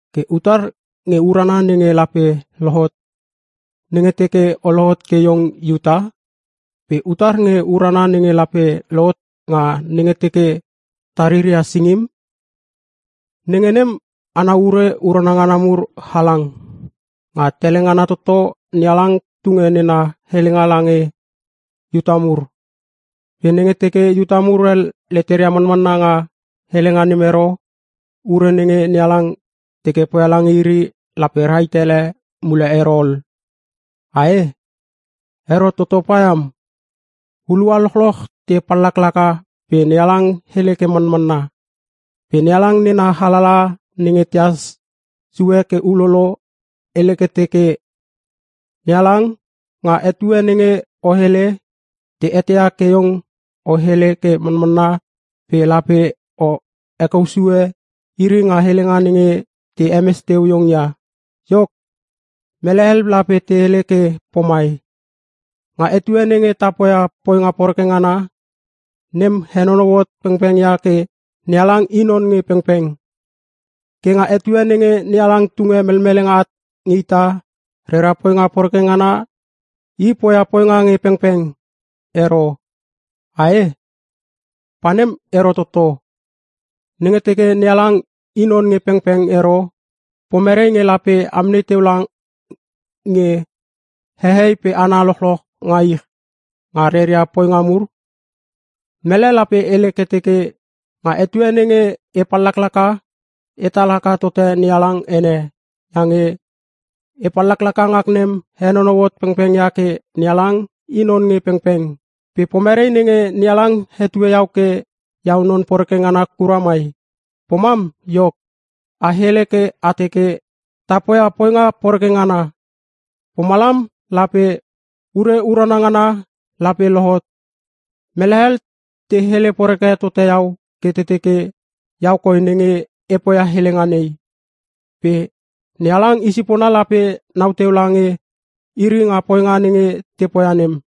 Ke utar nge urana nenge lape lohot nenge teke o lohot ke iong Iuta? Pe utar nge urana nenge lape lohot nga nenge teke te riria singim? Nenge nem ana ure urana ngana mur halang. Nga tele ngana toto NeHalang tunge nena helenga lange Iuta mur. Pe nenge teke Iuta mur hel leteria manmanna nga helenga nem ero, ure nenge NeHalang teke poia lange iri lape rahit ele mule ero ol. Ae? Ero toto paiam! Hulua lochloch te pallaklaka pe NeHalang hele ke manmanna. Pe NeHalang nena alalaha nenge tehas sue ke ulolo hele ke teke, “NeHalang, nga etue nenge o hele, te eteia ke iong o hele ke manmanna pe lape o hekousue iri nga helenga nenge te hemes teu iong ia.” Iok, mele hel lape te hele ke pomai: Nga etue nenge ta poia poinga poreke ngana, nem henonou hot pengpeng ia ke NeHalang i non nge pengpeng. Ke nga etue nenge NeHalang tunge melmelenga at nge ita nga rera poinga poreke ngana I poia poinga nge pengpeng ero. Ae? Pa nem ero toto! Nenge teke NeHalang i non nge pengpeng ero, pomerei nge lape amnei teu lange hehei pe hana lochloch nga ich, nga reria poinga mur? Mele lape hele ke teke, “Nga etue nenge e pallaklaka etal haka totote NeHalang ene, iange e pallaklaka ngak nem henonou hot pengpeng ia ke NeHalang i non nge pengpeng. Pe pomerei nenge NeHalang hetue iau ke iau non poreke ngana kura mai?” Pomam iok, a hele ke a teke, “Ta poia poinga poreke ngana, pomalam lape ure urana ngana lape lohot.” Mele hel te hele poreke tote iau ke te teke iau koi nenge e poia helenga nei. Pe NeHalang i sipona lape nau teu lange iri nga poinga nenge te poia nem.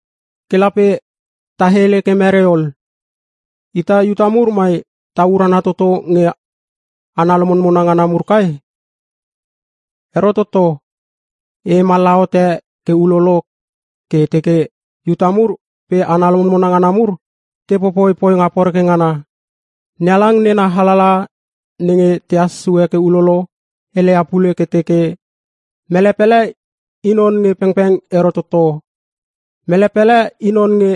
Ke lape ta hele ke merei ol? Ita Iuta mur mai ta urana toto nge hana lomonmona ngana mur kai? Ero toto! E hemallaha hote ke ulolo ke e teke Iuta mur pe hana lomonmona ngana mur te popoi poinga poreke ngana. NeHalang nena alalaha nenge tehas sue ke ulolo heleia pule ke teke, “Mele pele i non nge pengpeng ero toto. Mele pele i non nge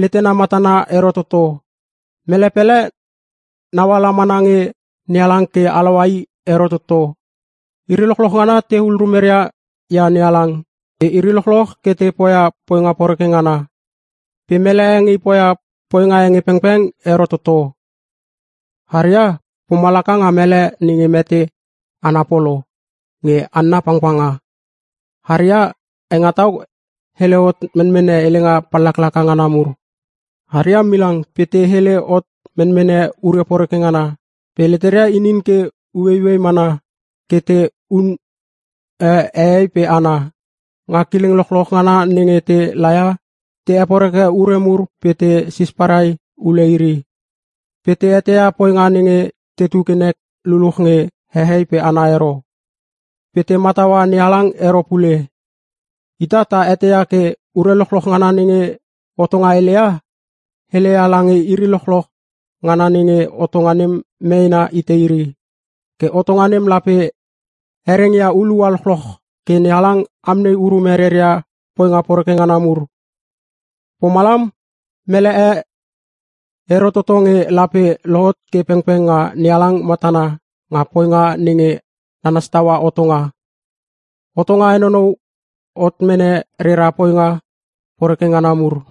letena matana ero toto. Mele pele naula mana nge NeHalang ke halaua i ero toto. Iri lochloch ngana te hul rumeria ia NeHalang. Pe iri lochloch ke te poia poinga poreke ngana. Pe mele e nge poia poinga e pengpeng ero toto. Harria pomalaka nga mele nenge mete ana polo nge hanna pangpanga. Aria hengetau hele hot menmene helenga pallaklaka ngana mur. Harria milang pe te hele hot menmene ure poreke ngana. Pe leteria inin ke ueiuei mana ke te hune hehei pe hana. Nga kileng lochloch ngana nenge te laia te heporeke ure mur pe te sisparai ule iri. Pe te eteia poinga nenge tetu ke nek luchluch nge hehei pe hana ero. Pe te mataua NeHalang ero pule.” Ita ta eteia ke ure lochloch ngana nenge hotonga heleia, heleia lange iri lochloch ngana nenge hotonga nem meena hite iri. Ke hotonga nem lape herengia hulua lochloch ke NeHalang amnei urume reria poinga poreke ngana mur. Pomalam mele e ero toto nge lape lohot ke pengpeng nga NeHalang matana nga poinga nenge nanas taua hotonga. Hotonga henonou hot mene rera poinga poreke ngana mur.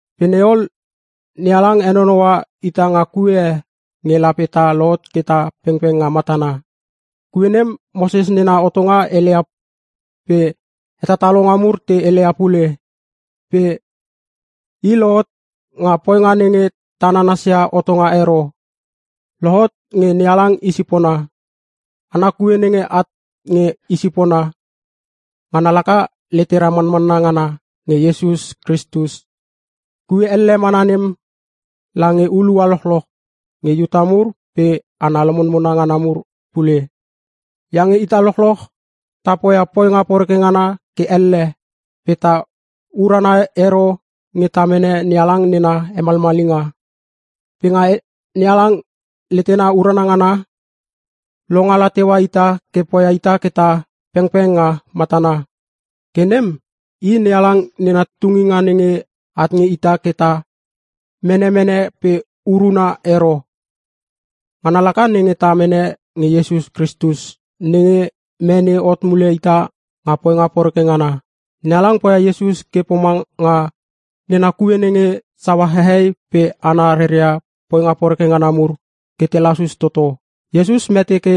Pe nei ol, NeHalang henonoua ita nga kue e nge lape ta lohot ke ta pengpeng nga matana. Kue nem Moses nena hotonga heleia pe hetatalonga mur te heleia pule. Pe i lohot nga poinga nenge ta nanasia hotonga ero. Lohot nge NeHalang i sipona. Ana kue nenge at nge I sipona, ngana laka letera manmanna ngana nge Iesus Kristus. Kue elle mana nem lange hulua lochloch (nge Iuta mur pe hana lomonmona ngana mur pule). Iange ita lochloch ta poia poinga poreke ngana ke elle pe ta urana ero nge ta mene NeHalang nena hemalmalinga. Pe nga NeHalang letena urana ngana, longala teua ita ke poia ita ke ta pengpeng nga matana. Ke nem i NeHalang nena tunginga nenge at nge ita ke ta mene mene pe uruna ero. Ngana laka nenge ta mene nge Iesus Kristus, nenge mene hot mule ita nga poinga poreke ngana. NeHalang poia Iesus ke pomanga nena kue nenge saua hehei pe hana reria poinga poreke ngana mur ke te lasus toto. Iesus mete ke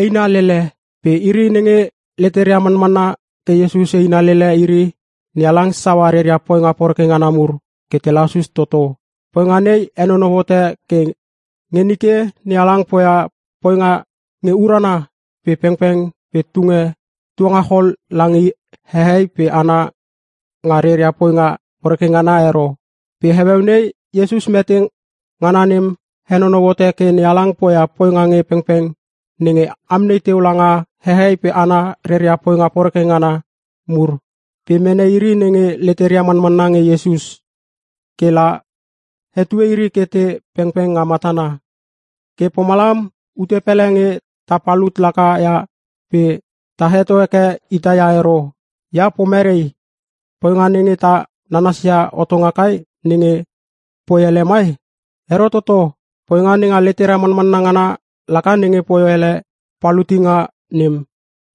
eina lele pe iri nenge leteria manmanna ke Iesus eina lele iri, NeHalang saua reria poinga poreke ngana mur ke te lasus toto. Poinga nei henonou hote ke nge nike NeHalang poia poinga nge urana pe pengpeng pe tunge tuangachol lange hehei pe hana nga reria poinga poreke ngana ero. Pe heueu nei Iesus mete ngana nem henonou hote ke NeHalang poia poinga nge pengpeng nenge amnei teu langa hehei pe hana reria poinga poreke ngana mur pe mene iri nenge leteria manmanna nge Iesus, ke la hetue iri ke te pengpeng nga matana. Ke pomalam ute pele nge ta palut laka ia pe ta heto heke ita ia ero. Ia pomerei? Poinga nenge ta nanasia hotonga kai nenge poi hele mai? Ero toto! Poinga nenga letera manmanna ngana laka nenge poi hele palutinga nem.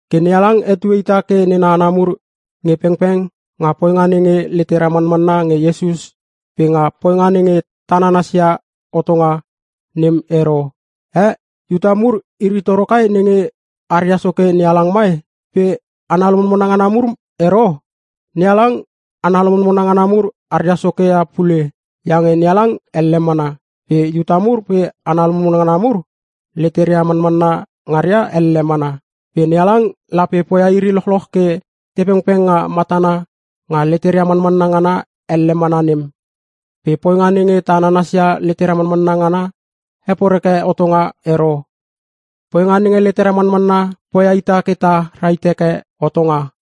Ke NeHalang hetue ita ke nena hana mur nge pengpeng nga poinga nenge letera manmanna nge Iesus pe nga poinga nenge ta nanasia hotonga, nem ero. Eh?! Iuta mur iri toro kai nenge aria Soke NeHalang mai? Pe hana lomonmona ngana mur ero? NeHalang, hana lomonmona ngana mur aria Soke ia pule. Iange NeHalang elle mana. Pe Iuta mur pe hana lomonmona ngana mur leteria manmanna ngaria elle mana. Pe NeHalang lape poia iri lochloch ke tepengpeng nga matana nga leteria manmanna ngana elle mana nem. Pe poinga nenge ta nanasia letera manmanna ngana heporeke hotonga ero. Poinga nenge letera manmanna poia ita ke ta rahit heke hotonga.